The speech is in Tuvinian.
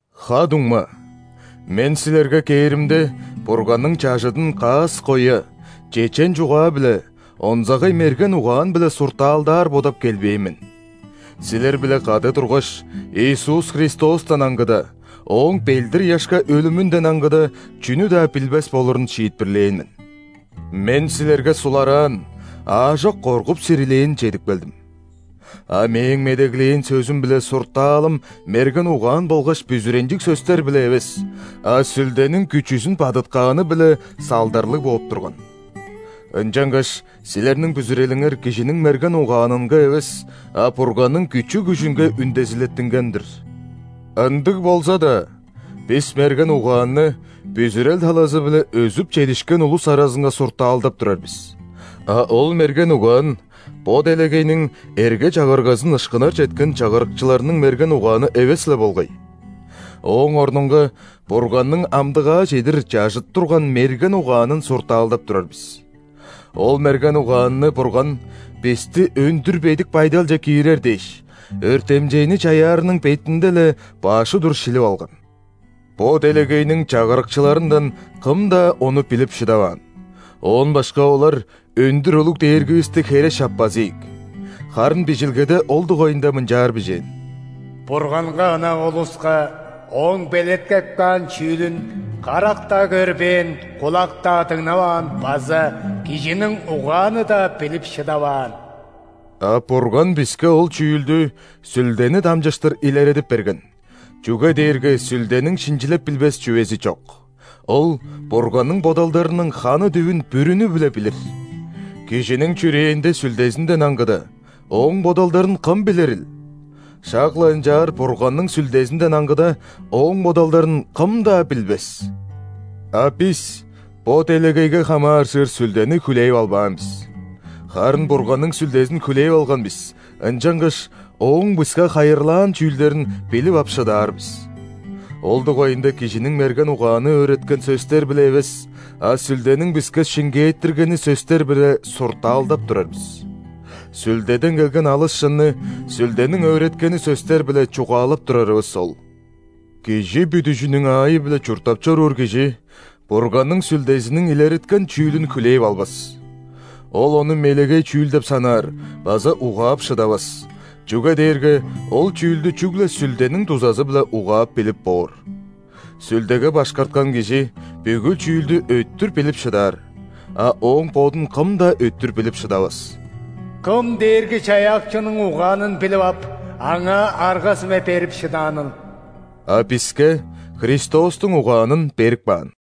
Ха-дуңма, мен силерге кээримде, Бурганның чажыдын каас-коя, чечен чугаа-биле, онзагай мерген угаан-биле суртаалдаар бодап келбээн мен. Силер-биле кады тургаш, Иисус Христостан аңгыда, Ооң ·белдир-ыяшка өлүмүнден аңгыда, чүнү-даа билбес болурун шиитпирлээн мен. Мен силерге сулараан, аажок коргуп-сирилээн чедип келдим. А мээң медеглээн сөзүм биле суртаалым мерген угаан болгаш бүзүренчиг сөстер-биле эвес, а Сүлдениң күчүзүн бадыткааны-биле салдарлыг бооп турган. Ынчангаш силерниң бүзүрелиңер кижиниң мерген угаанынга эвес, а Бурганның күчү-күжүнге үндезилеттинген-дир. Ындыг болза-даа, бис мерген угаанны бүзүрел талазы-биле өзүп чедишкен улус аразынга суртаалдап турар бис. А ол мерген угаан – бо делегейниң эрге-чагыргазын ышкынар четкен чагырыкчыларының мерген угааны эвес-ле болгай. Ооң орнунга Бурганның амдыгаа чедир чажыт турган мерген угаанын суртаалдап турар бис. Ол мерген угаанны Бурган бисти өндүр бедик байдалче киирер дээш, өртемчейни чаяарының бетинде-ле баш удур шилип алган. Бо делегейниң чагырыкчыларындан кым-даа ону билип шыдаваан, оон башка олар өндүр улуг Дээргивисти хере шаппас ийик. Харын Бижилгеде ол дугайында мынчаар бижээн:«Бурганга ынак улуска Ооң белеткеп каан чүүлүн карак-даа көрбээн,кулак-даа дыңнаваан база кижиниң угааны-даа билип шыдаваан». А Бурган биске ол чүүлдү Сүлдени дамчыштыр илередип берген, чүге дээрге Сүлдениң шинчилеп билбес чүвези чок, Ол Бурганның бодалдарының ханы дүвүн бүрүнү-биле билир. Кижиниң чүрээнде сүлдезинден аңгыда, ооң бодалдарын кым билирил? Шак-ла ынчаар Бурганның Сүлдезинден аңгыда, Ооң бодалдарын кым-даа билбес. А бис бо делегейге хамааржыр сүлдени хүлээп албаан бис. Харын Бурганның Сүлдезин хүлээп алган бис, ынчангаш Ооң биске хайырлаан чүүлдерин билип ап шыдаар бис. Ол дугайында кижиниң мерген угааны өөреткен сөстер-биле эвес, а Сүлдениң биске шиңгээттиргени сөстер-биле суртаалдап турар бис. Сүлдеден келген алыс шынны Сүлдениң өөреткени сөстер-биле чугаалап турарывыс ол. Кижи бүдүжүнүң аайы-биле чурттап чоруур кижи Бурганның Сүлдезиниң илереткен чүүлүн хүлээп албас. Ол ону мелегей чүүл деп санаар база угаап шыдавас, чүге дээрге ол чүүлдү чүгле Сүлдениң дузазы-биле угаап билип боор. Сүлдеге башкарткан кижи бүгү чүүлдү өттүр билип шыдаар, а ооң бодун кым-даа өттүр билип шыдавас. «Кым Дээрги-Чаяакчының угаанын билип ап,Аңаа арга-сүме берип шыдааныл?» А биске Христостуң угаанын берип каан.